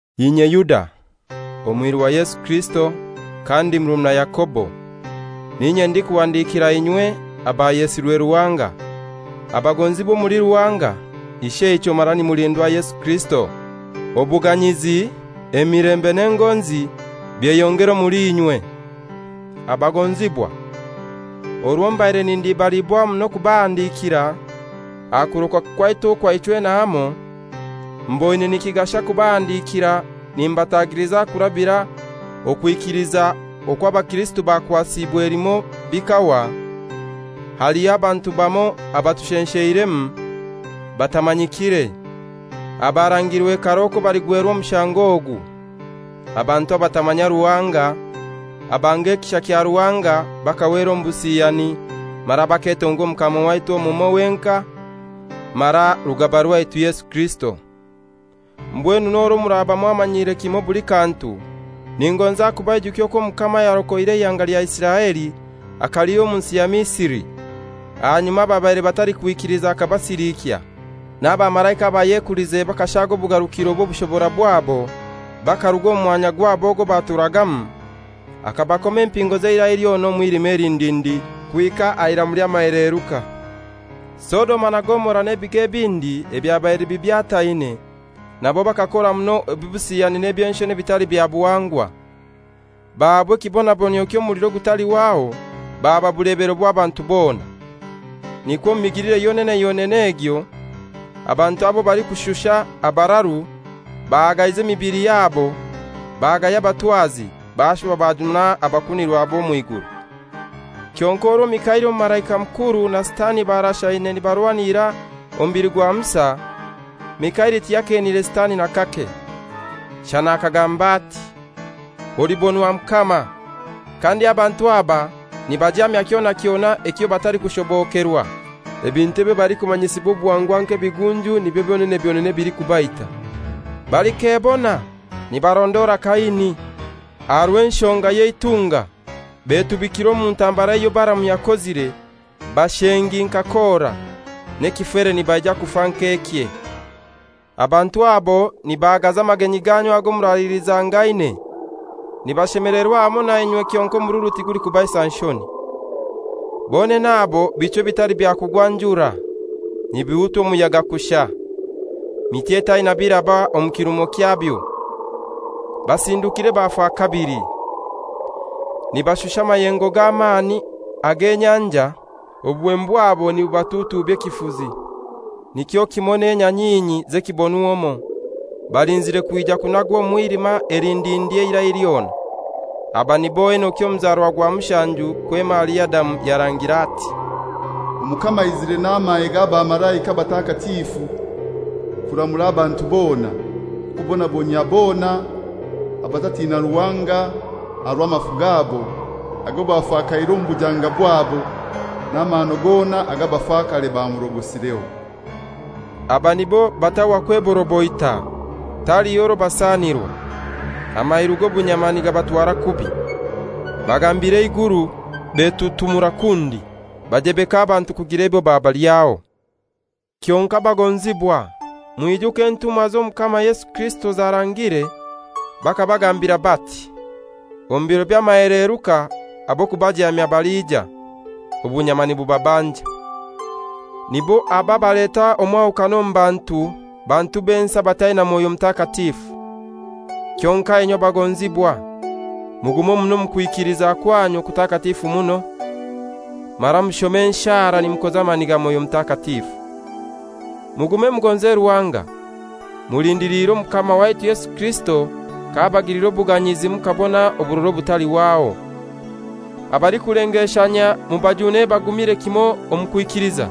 Inye Yuda, omwiru wa Yesu Kirisito, kandi murumuna Yakobo, n'inye ndikuhandikira inywe abayesirwe Ruhanga, abagonzibwa omuli Ruhanga Isheichwe mara nimulindwa Yesu Kirisito. Obuganyizi, emilembe n'engonzi byeyongere omuli inywe. Abagonzibwa, orwo mbaire nindibaliibwa muno kubahandikira aha kurokoka kwaitu okwa ichwena hamoi, mboine nikigasha kubahandikira nimbatagiliza kurabira okwikiliza okw'abakirisito bakwasiibwe limoi bikahwa. Haliho abantu bamoi abatushensheiremu batamanyikire, abarangiirwe karai okwo baligwerwa omushango ogu, abantu abatamanya Ruhanga, abanga ekisha kya Ruhanga bakahwera omu busiyani mara baketonga Omukama waitu omumoi wenkai mara Rugaba rwaitu Yesu Kirisito. Mbwenu n'orwo muraba mwamanyire kimoi buli kantu, ningonza kubaijukya okwo Omukama ayarokoire eihanga lya Isiraeli akalihya omu nsi ya Misri, ahanyuma ababaire batalikwikiliza akabasilikya. N'abamalaika abayekulize bakashaga obugarukiro bw'obushobora bwabo bakaruga omu mwanya gwabo ogwo baturagamu, akabakoma empingo ez'eirai lyona omu mwilima elindindi kuhika aha iramu ely'amaheleeruka. Sodoma na Gomora n'ebigo ebindi ebyabaire bibyataine nabo bakakora muno obusiyani n'eby'enshoni ebitali bya buhangwa, bahaabwa ekibonabonyio ky'omuliro ogutalihwaho, baba bulebero bw'abantu bona. Nikwo omu migilire yonene yonene egyo abantu aba abalikushusha abararu bahagaize emibili yabo, bagaya abatwazi, bashuba bajuma abakunirwa b'omw'iguru. Kyonkai orwo Mikaili Omumalaika Mukuru na Sitani barashaine nibarwanira omubili gwa Musa, Mikaili tiyakeenire Sitani n'akake, shana akagamba ati, «Olibonwa Mukama.» Kandi abantu aba nibajaamya kyona kyona ekyo batalikushobokerwa. Ebintu ebyo balikumanyisibwa obuhangwa nk'ebigunju nibyo byonene byonene ebilikubaita. Balikebona! Nibarondora Kaini. Aha rw'enshonga y'eitunga betubikire omu ntambara eyo Balaamu yakozire. Bashengi nka Kora, n'ekifere nibaija kufa nk'ekye. Abantu abo nibahagaza amagenyi ganyu ago muralilizangaine. Nibashemelerwa hamoi nainywe kyonkai omururu tigulikubaisa nshoni. Bonene abo bichwi ebitali bya kugwa njura, nibihutwa omuyaga kushai; miti etaina biraba omu kirumo kyabyo, basindukire bafa kabili. Nibashusha amayengo g'amani ag'enyanja, obuhemu bwabo nibubatutuubya ekifuzi. Nikyo kimoi n'enyanyinyi z'ekibonw'omoi, balinzire kwija kunagwa omu mwilima elindindi eirai lyona. Aba nibo Enoki ow'omuzarwa gwa mushanju kwema ahali Adamu yarangire ati, «Omukama aizire n'amahe g'abamalaika batakatifu, kuramura abantu bona, kubonabonyia bona abatatina Ruhanga aha rw'amafu gabo ago bafakaire omu bujanga bwabo, n'amahano gona ag'abafakare bamurogosireho.» Aba nibo batahwa kweboroboita, taliho rwo basanirwa, amairu g'obunyama nigabatwara kubi, bagambira eiguru, betutumura kundi, bajebeka abantu kugira ebyo babalyaho. Kyonkai bagonzibwa, mwijuke entumwa z'Omukama Yesu Kirisito zarangire. Bakabagambira bati, «Omu biro by'amaheleruka ab'okubajamya baliija, obunyama nibubabanja.» Nibo aba abaleta omwahukano omu bantu, bantu b'ensi abataina Mwoyo Mutakatifu. Kyonkai inywe bagonzibwa, mugume muno omu kwikiliza kwanyu okutakatifu muno; mara mushome enshara nimukoza amani ga Mwoyo Mutakatifu. Mugume mugonze Ruhanga, mulindiliire Omukama waitu Yesu Kirisito k'abagilira obuganyizi mukabona oburora obutalihwaho. Abalikulengeshanyia mubajune bagumire kimoi omu kwikiliza;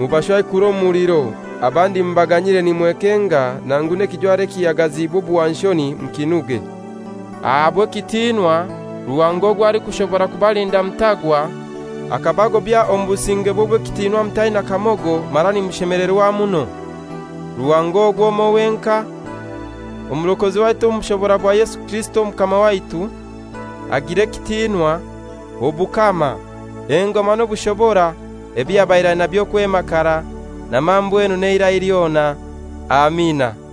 mubashwaikure omu muliro, abandi mubaganyire nimwekenga, nangu n'ekijwaro ekihagaziibwe obuhwanshoni mukinuge. Ahabwe ekitiinwa, Ruhanga ogwo alikushobora kubalinda mutagwa, akabagobya omu busingebwe obw'ekitinwa mutaina kamogo mara nimushemelerwa muno. Ruhanga ogwo omoi wenkai, Omurokozi waitu omu bushobora bwa Yesu Kirisito Omukama waitu, agire ekitinwa, obukama, engoma n'obushobora, ebyo yabaire ainabyo kwema karai, na mambwenu n'eirai lyona. Amina.